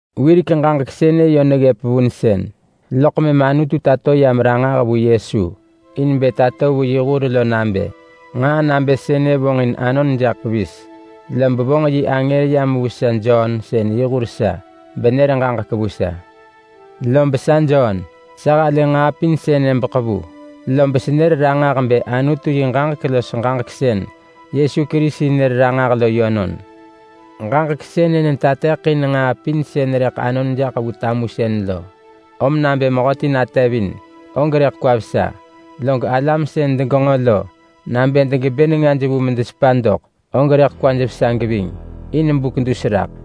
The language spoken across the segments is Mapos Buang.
Wirek ġaġek sënë yö neggëp vunsën, loḳ mëm Anutu tato yam ranġah vu Yesu in bë tato vu yi hur lo nabë: Nġaa nabë sënë vonġin anon jaḳ pevis. Lob vonġ yi angër yam vu sa Jon sën yi hur sa, benër ġaġek vu sa. Lob sa Jon, sa halë nġaa pin sënë beḳevu, lob senër ranġah bë Anutu yi ġaġek los ġaġek sën Yesu Kerisi nër ranġah lo yönon. Ġaġek sënë netateḳin nġaa pin sën rëḳ anon jaḳ vu tamusën lo. Om nabë mehöti natevin og rëḳ kwa vesa. Log alam sën degenġo lo, nabë degebë nengaj vu medesepa doḳ, og rëḳ kwaj vesa geving in buk dus raḳ.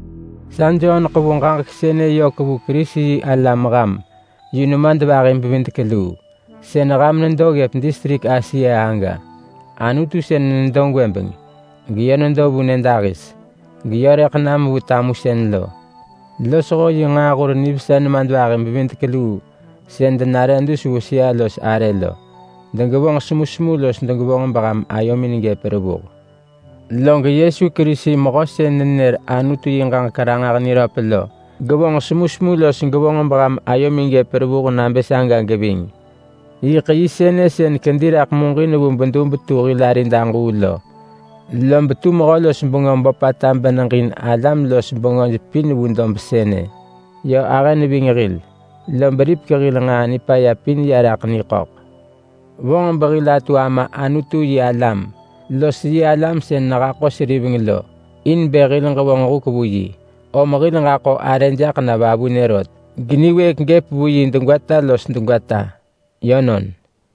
Sa Jon ḳevu ġaġek sënë yök vu Kerisi-yi-alam ham yu nemadvahi-bevidek-luu sën ham nedo ggëp distrik Asia aga. Anutu sën nedo gwëbeng, geyö nedo vu nyëdahis, geyö rëḳ nam vu tamusën lo, losho yi nġaahur nivesa nemadvahi-bevidek-luu sën denare dus vu sëa-los-arë lo, degevonġ semusemu los degevonġ beham ayomin gëp revuh. Log Yesu Kerisi mehö sën nenër Anutu yi ġaġek ranġah niröp lo gevonġ semusemu los gevonġ beham ayomin gëp revuh nabë saga geving. Yiḳ yi sënë sën kedi raḳ muġin vu bedub tu hil arid aġuu lo. Lob tu mehö-los-bengö böpata beneġin alam-los-bengöj pin vu dob sënë. Yö ahë neving hil, lob ripek hil nġaa nipaya pin ya raḳ niḳöḳ. Vonġ behil atu Ama Anutu yi alam los yi alam sën nehaḳo seriveng lo, in bë hil ġevonġ huk vu yi. Om hil ġaḳo arë jaḳ na vavunë rot, geniwëëk gëp vu yi degwata los degwata. Yönon.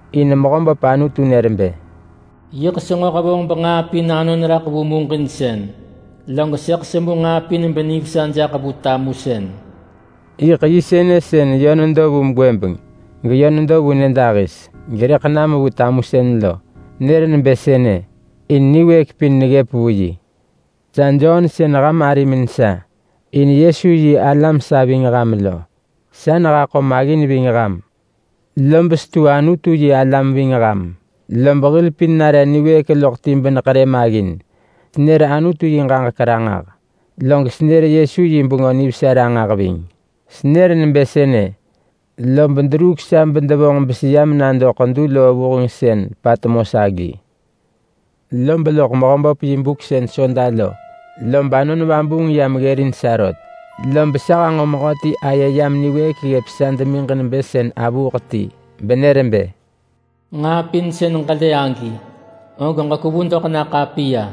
In Mehöböp Anutu nër bë, “Yiḳ senġo hevonġ benġaa pin anon raḳ vu muġinsën, log sëḳ semu nġaa pin benivesa jaḳ vu tamusën.” Yiḳ yi sënë sën yö nedo vu gwëbeng, geyö nedo vu nyëdahis, gerëḳ nam vu tamusën lo. Nër nebë sënë, in niwëëk pin neggëp vu yi. Sa Jon sën ham arimin sa, in Yesu yi alam sa ving ham lo. Sa nehaḳo maggin ving ham, lob setu Anutu yi alam ving ham. Lob hil pin nare niwëëk loḳ ti beneḳerë maggin. Senër Anutu yi ġaġek ranġah, log senër Yesu yi Bengö Nivesa ranġah ving. Senër nebë sënë, lob deruuk sa bedevonġ beseyam nado ḳedu loo vuheng sën Patmos agi. Lob loḳ Mehöböp yi buk sën Soda lo, lob Anon Vabuung yam ggërin sa rot. Lob sa hanġo mehöti aye yam niwëëk ggëp sa demiġ nebë sën avuuḳ ti, benër bë, “Nġaa pin sën ġelë agi, og ġekwevu doḳ na ḳapiya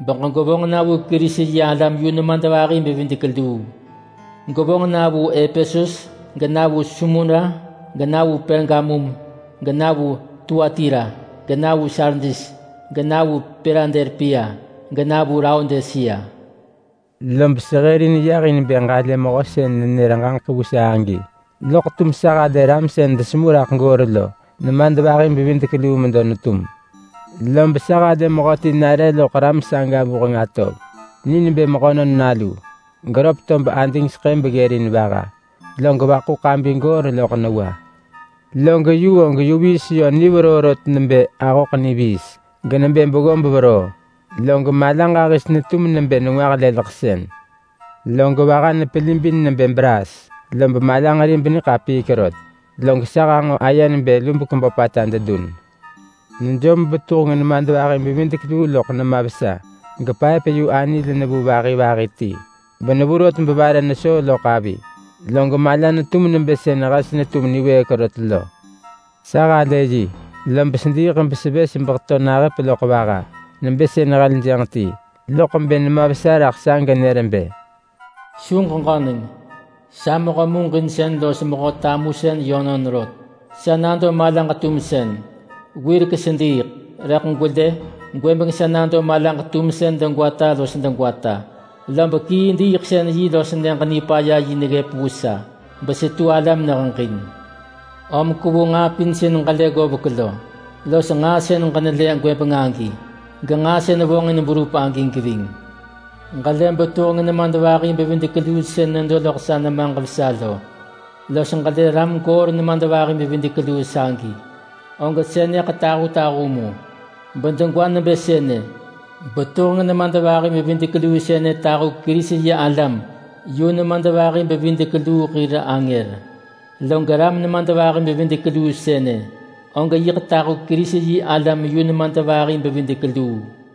begwevonġ na vu Kerisi-yi-alam yu nemadvahi-bevidek-luu. Gwevonġ na vu Epesus, gena vu Smurna ga, na vu Pergamum ga, na vu Tuatira ga, na vu Sardis ga, na vu Piladelpia ga, na vu Laodisea.” Lob sehërin yah in bë ġalë mehö sën nenër ġaġek vu sa agi, loḳ tum sa halë ram sën desemu raḳ goor lo nemadvahi-bevidek-luu medo netum. Lob sa halë mehöti nare loḳ ram saga vuheng atov. Ni nebë Mehönon Nalu, geröp tob adingseḳë beggërin vaha, log vaḳu ḳabi goor loḳ newa. Log yu og yu viis yö ni veroo rot nebë ahöḳ niviis, genebë beggob veroo, log mala ġahis netum nebë nengwah leleḳsën. Log vaha nepelibin nebë braas, lob malanġeri beniḳapiik rot. Log sa hanġo aye nebë lubek böpata dedun. Nejom betuheng nemadvahi-bevidek-luu loḳ nema vesa. Gepaëp-yu-anil nevu vahi vahi ti, benevu rot bevare nesoo loḳ avi. Log mala netum nebë sën hes netum niwëëk rot lo. Sa halë yi, lob sediiḳ besevës beheto nahëp loḳ vaha nebë sën heljënġ ti. Loḳ bë nema vesa raḳ sa genër bë, “Su ġeġöneng! Sa mehö muġinsën los mehö tamusën yönon rot. Sa nado malaġ-tumsën. Wirek sediiḳ, rëḳ gwelë! Gwëbeng sa nado malaġ-tumsën degwata los degwata. Lob kii diiḳsën-yi los Nyëġ-Nipaya-yi neggëp vu sa besetu ala meneheġin. Om kwevu nġaa pin sën ġelë ggovek lo, los nġaa sën ġenelë gwëbeng agi, genġaa sën vonġin berup agi geving. Ġelë betuheng nemadvahi-bevidek-luu sën nedo loḳ sa nemaġ vesa lo, los ġelë ram goor nemadvahi-bevidek-luu sagi, og sënëḳ tahutahu mu bedegwa nebë sënë: Betuheng nemadvahi-bevidek-luu sënë tahu Kerisi-yi-alam yu nemadvahi-bevidek-luu hir angër. Log ram nemadvahi-bevidek-luu sënë, og yiḳ tahu Kerisi-yi-alam yu nemadvahi-bevidek-luu.”